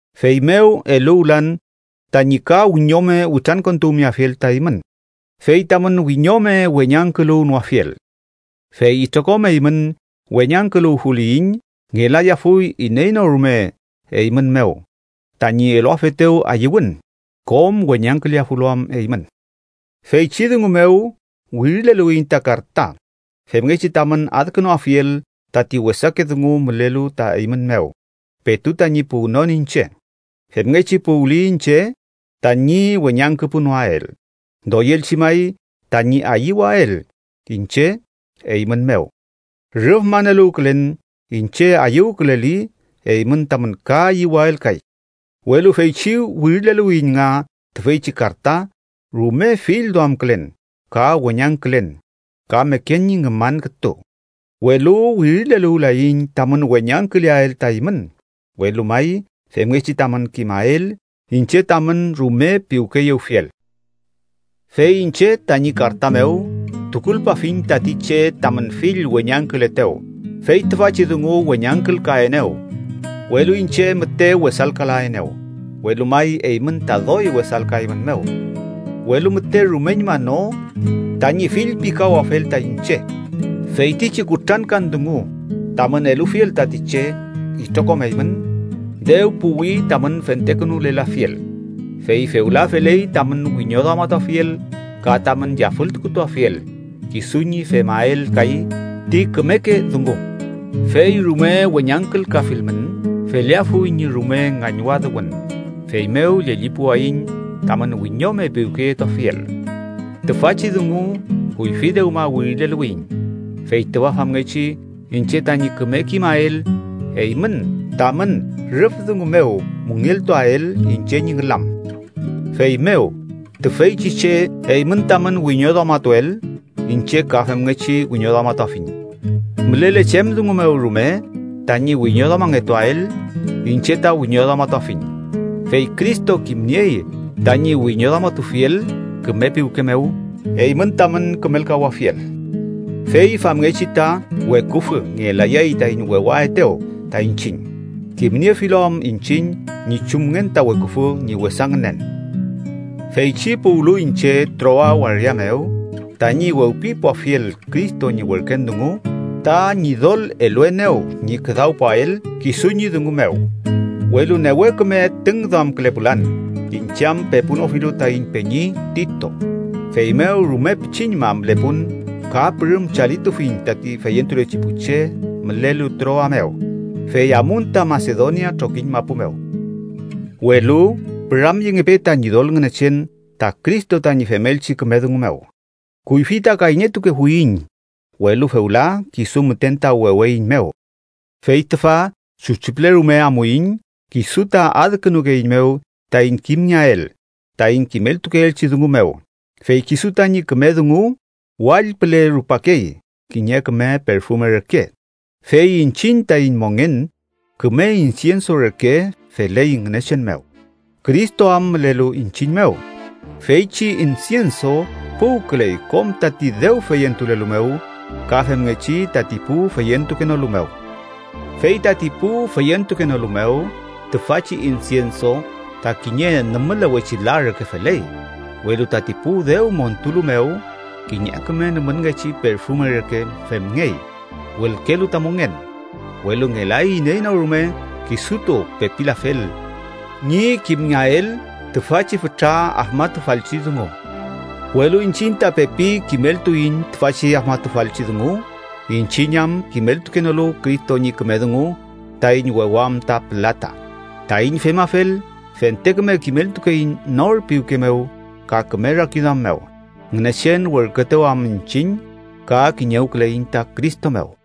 Feymew eluwlan tañi ka wiñome witrankontuwmeafiel ta eymün, fey tamün wiñome weñangküluwnoafiel. Fey itrokom eymün weñangküluwfuliyiñ, ngelayafuy iney no rume eymün mew tañi eluafetew ayüwün, kom weñangküleafulu am eymün. Feychi dungu mew wirileluwiyiñ ta karta, femngechi tamün adkünuafiel tati wesake dungu mülelu ta eymün mew petu tañi puwnon iñche. Femngechi puwli iñche, tañi weñangküpunoael, doyelchi may tañi ayüwael iñche eymün mew. Rüf maneluwkülen iñche ayüwküleli, eymün tamün ka ayüwael kay. Welu feychi wirileluwiyiñ nga tüfeychi karta rume fillduamkülen ka weñangkülen ka meken ñi ngüman kütu. Welu wirileluwlayiñ tamün weñangküleael ta eymün, welu may femngechi tamün kimael iñche tamün rume piwkeyewfiel. Fey iñche tañi karta mew tukulpafiñ tati che tamün fill weñangkületew. Fey tüfachi dungu weñangkülkaenew, welu iñche müte wesalkalaenew, welu may eymün ta doy wesalkaeymünmew, welu müte rumeñma no tañi fillpikawafel ta iñche. Feytichi kutrankan dungu tamün elufiel tati che itrokom eymün, dew puwi tamün fentekünulelafiel, fey fewla feley tamün wiñoduamatuafiel ka tamün yafültukuafiel kisu ñi femael kay ti kümeke dungu. Fey rume weñangkülkafilmün, feleafuy ñi rume ngañwadüwün. Feymew llellipuwayiñ tamün wiñome piwkeyetuafiel. Tüfachi dungu kuyfi dewma wirileluwiyiñ, fey tüfa famngechi iñche tañi küme kimael eymün tamün rüf dungu mew müngeltuael iñche ñi ngülam. Feymew tüfeychi che eymün tamün wiñoduamatuel, iñche ka femngechi wiñoduamatuafiñ. Mülele chem dungu mew rume tañi wiñoduamangetuael, iñche ta wiñoduamatufiñ. Fey Cristo kimniey tañi wiñoduamatufiel küme piwke mew, eymün tamün kümelkawafiel. Fey famngechi ta weküfü ngelayay taiñ wewaetew ta iñchiñ, kimniefilu am iñchiñ ñi chumngen ta weküfü ñi wesa ngünen. Feychi puwlu iñche Troa waria mew tañi wewpipuafiel Cristo ñi werken dungu, ta Ñidol eluenew ñi küdawpuael kisu ñi dungu mew. Welu newe küme tüngduamkülepulan, iñche am pepunofilu taiñ peñi Tito. Feymew rume pichiñma mülepun ka pürüm chalitufiñ tati feyentulechi pu che mülelu Troa mew, fey amun ta Masedonia trokiñ mapu mew. Welu ¡püramyengepe ta Ñidol Ngünechen ta Cristo tañi femelchi küme dungu mew! Kuyfi ta kayñetukefuiñ, welu fewla kisu müten ta weweiñmew. Fey tüfa chuchi püle rume amuiñ, kisu ta adkünukeeiñmew taiñ kimngeael taiñ kimeltukeelchi dungu mew, fey kisu tañi küme dungu wall püle rupakey kiñe küme perfume reke. Fey iñchiñ taiñ mongen küme insienso reke feley Ngünechen mew, Cristo am mülelu iñchiñ mew. Feychi insienso puwküley kom tati dew feyentulelu mew ka femngechi tati pu feyentukenolu mew. Fey tati pu feyentukenolu mew, tüfachi insienso ta kiñe nümülewechi la reke feley, welu tati pu dew montulu mew, kiñe küme nümünngechi perfume reke femngey, wülkelu ta mongen. ¡Welu ngelay iney no rume kisutu pepilafel ñi kimngeael tüfachi fütra afmatufalchi dungu! Welu iñchiñ ta pepi kimeltuiñ tüfachi afmatufalchi dungu, iñchiñ am kimeltukenolu Cristo ñi küme dungu taiñ wewam ta pülata. Taiñ femafel, fente küme kimeltukeiñ nor piwke mew ka küme rakiduam mew, Ngünechen werküetew am iñchiñ ka kiñewküleiñ ta Cristo mew.